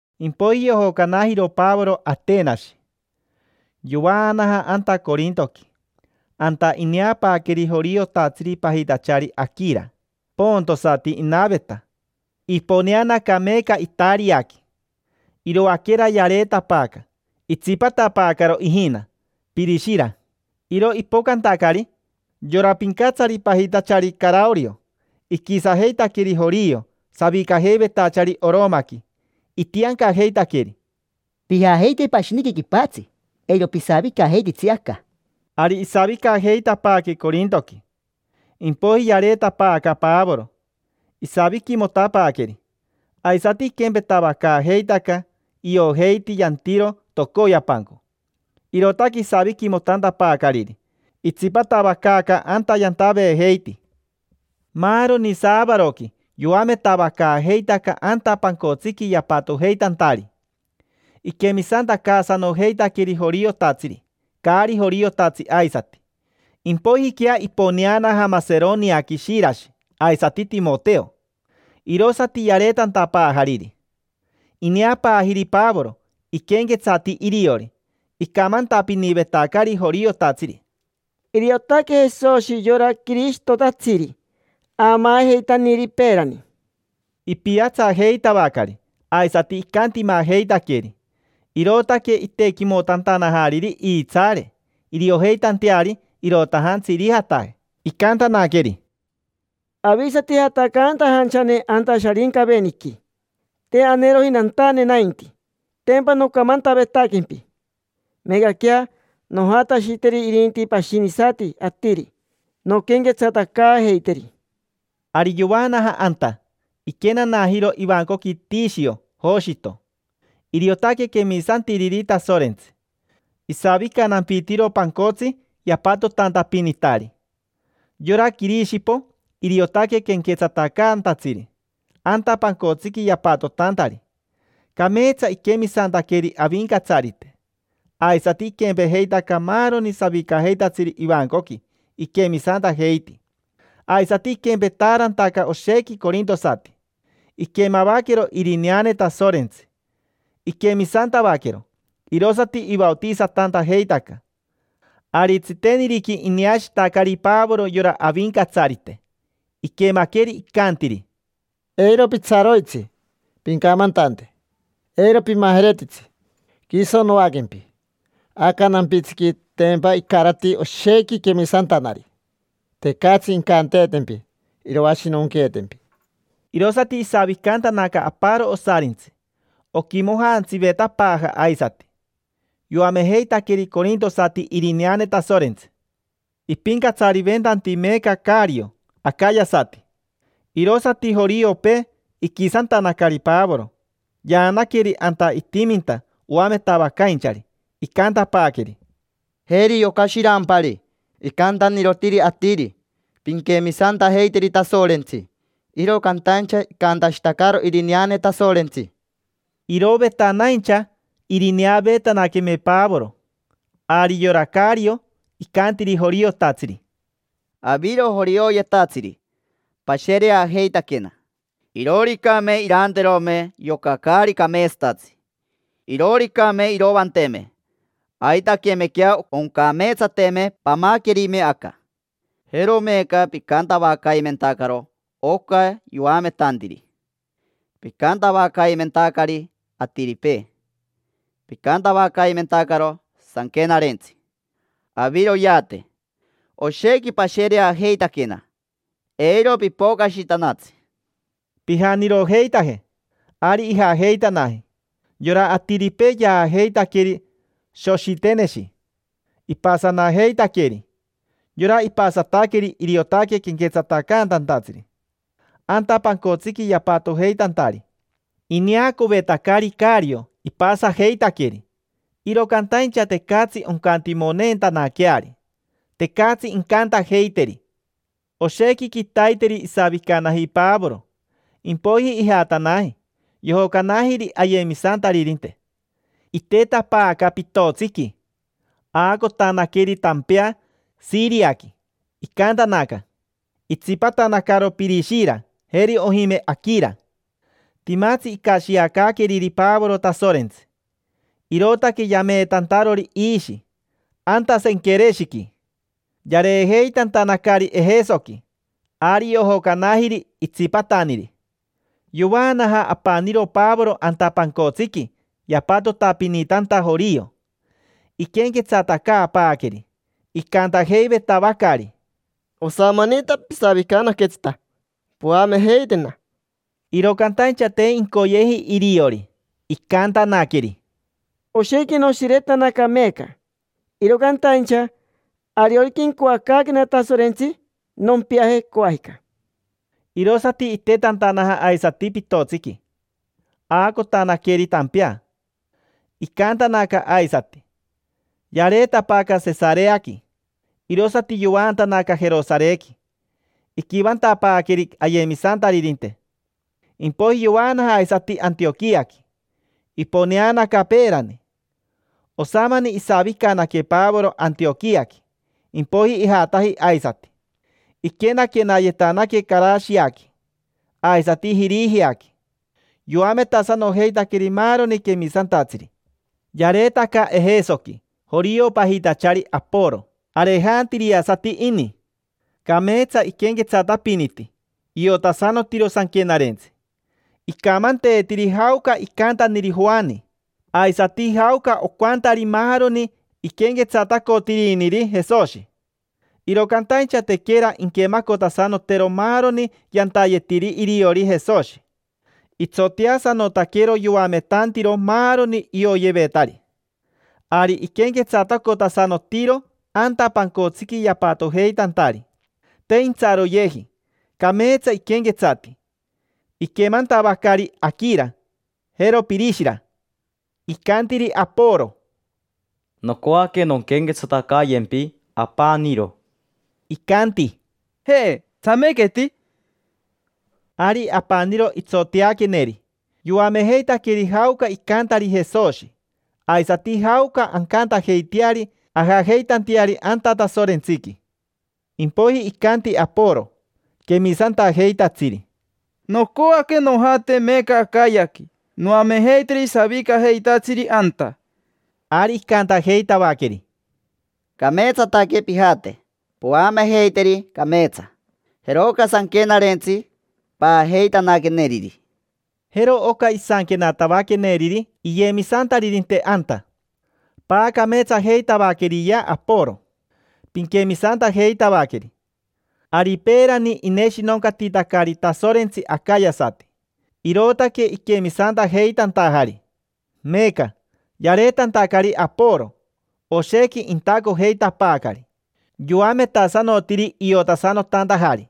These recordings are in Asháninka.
Impoiji yojocanajiro Pavoro Atenashi, yovaanaja anta Corintoqui. Anta ineapaaqueri joriotatsiri pajitachari Aquira. Pontosati inaveta, iponeanaca meeca Itariaqui. Iroaquera yareetapaaca. Itsipatapaacaro ijina, Pirishira. Iro ipocantacari, yora pincatsari pajitachari Caraorio iquisajeitaqueri jorio savicajeivetachari Oromaqui, itiancajeitaqueri: —Pijajeite pashiniqui quipatsi, eiro pisavicajeititsi aca. Ari isavicajeitapaaque Corintoqui. Impoiji yareetapaaca Pavoro, isaviquimotapaaqueri. Aisati iquempetavacaajeitaca, iojeiti yantiro tocoyapanco. Irootaque isaviquimotantapaacariri, itsipatavacaaca anta yantaveejeiti. Maaroni saavaroqui yoametavacaajeitaca anta pancotsiqui yapatojeitantari. Iquemisantacaasanojeitaqueri joriotatsiri, caari joriotatsi aisati. Impoijiquea iponeanaja Maseroniaqui Shirashi aisati Timoteo. Irosati yareetantapaajariri. Ineapaajiri Pavoro, iquenquetsati iriori. Icamantapinivetacari joriotatsiri: —Iriotaque Jesoshi yora Quirishitotatsiri aamaajeitaniri peerani. Ipiatsajeitavacari aisati icantimajeitaqueri, irootaque itequimotantanajariri iitsaare iriojeitanteari irotajatsi irijataje. Icantanaqueri: —Avisati jatacantajanchane anta Sharincaveniqui: te aneeroji nantane nainti, tempa nocamantavetaquempi. Meecaquea nojatashiteri irinti pashinisati atiri, nonquenquetsatacaajeiteri. Ari yovaanaja anta, iquenanajiro ivancoqui Tishio Joshito: iriotaque quemisantiriri Tasorentsi. Isavicanampitiro pancotsi yapatotantapinitari. Yora Quirishipo iriotaque quenquetsatacaantatsiri anta pancotsiqui yapatotantari. Cameetsa iquemisantaqueri Avincatsarite. Aisati iquempejeitaca maaroni savicajeitatsiri ivancoqui, iquemisantajeiti. Aisati iquempetaarantaca oshequi corintosati. Iquemavaquero irineane Tasorentsi, iquemisantavaquero, irosati ivaotisatantajeitaca. Ari tsiteniriqui ineashitacari Pavoro yora Avincatsarite, iquemaqueri icantiri: —Eiro pitsaroitsi. Pincamantante, eiro pimajeretitsi. Quiso noaquempi. Aca nampitsiqui, tempa icarati oshequi quemisantanari. Tecatsi incanteetempi iroashinonqueetempi. Irosati isavicantanaca aparo osarintsi, oquimojantsivetapaaja aisati. Yoamejeitaqueri corintosati irineane Tasorentsi. Ipincatsariventanti meeca Cario acayasati. Irosati joriopee iquisantanacari Pavoro. Yaanaqueri anta itiminta oametavacainchari. Icantapaaqueri: —Jeri yoca shirampari, icantanirotiri atiri: “Pinquemisantajeiteri Tasorentsi”, iro cantaincha icantashitacaro irineane Tasorentsi. Irovetanaincha irineaveetanaqueme Pavoro, ari yora Cario icantiri joriotatsiri: —Aviro jorioyetatsiri, pashereajeitaquena. Irooricame iranterome yoca caari cameetsatatsi, irooricame iroanteme, aitaquemequea oncameetsateme pamaquerime aca. Jero meeca picantavacaimentacaro oca yoametantiri. Picantavacaimentacari atiripee. Picantavacaimentacaro Sanquenarentsi. Aviroyeate. Oshequi pashereajeitaquena: eiro pipocashitanatsi. Pijanirojeitaje. Ari ijajeitanaji. Yora atiripee yaajeitaqueri Soshiteneshi, shepi; ipasanajeitaqueri, tac, tac. Yora ipasataqueri iriotaque quenquetsatacaantatsiri anta pancotsiqui yapatojeitantari. Ineacovetacari Cario ipasajeitaqueri, iro cantaincha tecatsi oncantimoneentanaqueari, tecatsi incantajeiteri. Oshequi quitaiteri isavicanaji Pavoro, impoiji ijatanaji, yojocanajiri ayemisantaririnte. Itetapaaca pitotsiqui, aacotanaqueri tampea Shiriaqui, icantanaca, shiririri. Itsipatanacaro Pirishira, jeri ojime, Aquira. Timatsi icashiacaaqueriri Pavoro Tasorentsi, irootaque yameetantarori iishi anta Senquereshiqui. Yareejeitantanacari Ejesoqui, ari yojocanajiri itsipataniri. Yovaanaja apaniro Pavoro anta pancotsiqui yapatotapinitanta jorio, iquenquetsatacaapaaqueri. Icantajeivetavacari: —Osamanita pisavicanaquetsita, poamejeitena. Iro cantaincha te incoyeji iriori. Icantanaqueri: —Oshequi noshiretanaca meeca, iro cantaincha, ariorica incoacaaquena Tasorentsi, nompiaje, coajica. Irosati itetantanaja aisati pitotsiqui, aacotanaqueri tampea, icaantanaca aisati shiririri. Yareetapaaca Sesareaqui, irosati yovaantanaca Jerosarequi, iquivantapaaqueri ayemisantaririnte. Impoiji yovaanaja aisati Antioquiaqui, iponeanaca peerani. Osamani isavicanaque Pavoro Antioquiaqui, impoiji ijataji aisati. Iquenaquenayetanaque Carashiaqui, aisati Jirijiaqui. Yoametasanojeitaqueri maaroni quemisantatsiri. Yareetaca Ejesoqui jorio pajitachari Aporo, arejantiriasati ini. Cameetsa iquenquetsatapiniti, iotasanotiro Sanquenarentsi. Icamanteetiri jaoca icantaniri Joani, aisati jaoca ocantari maaroni iquenquetsatacotiriniri Jesoshi, iro cantaincha tequera inquemacotasanotero maaroni yantayetiri iriori Jesoshi. Itsoteasanotaquero yoametantiro maaroni ioyevetari. Ari iquenquetsatacotasanotiro anta pancotsiqui yapatojeitantari. Te intsaroyeji, cameetsa iquenquetsati. Iquemantavacari Aquira, jero Pirishira, icantiri Aporo: —Nocoaque nonquenquetsatacayempi apaniro. Icanti: —Ja, tsamequeti. Ari apaniro itsoteaqueneri, yoamejeitaqueri jaoca icantari Jesoshi, aisati jaoca ancantajeiteari ajajeitanteari anta Tasorentsiqui. Impoiji icanti Aporo quemisantajeitatsiri: —Nocoaque nojate meeca Acayaqui, noamejeiteri savicajeitatsiri anta. Ari icantajeitavaqueri: —Cameetsataque pijate, poamejeiteri cameetsa. Jeroca sanquenarentsi paajeitanaqueneriri. Jero oca isanquenatavaqueneriri iyemisantaririnte anta: “Paacameetsajeitavaqueriyea Aporo, pinquemisantajeitavaqueri”. Ari peerani ineshinoncatitacari Tasorentsi acayasati, irootaque iquemisantajeitantajari. Meeca, yareetantacari Aporo, oshequi intacojeitapaacari. Yoametasanotiri iotasanotantajari.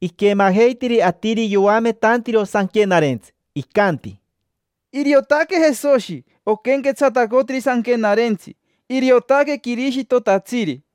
Iquemajeitiri atiri yoametantiro Sanquenarentsi, icanti: —Iriotaque Jesoshi oquenquetsatacotiri Sanquenarentsi, iriotaque Quirishitotatsiri.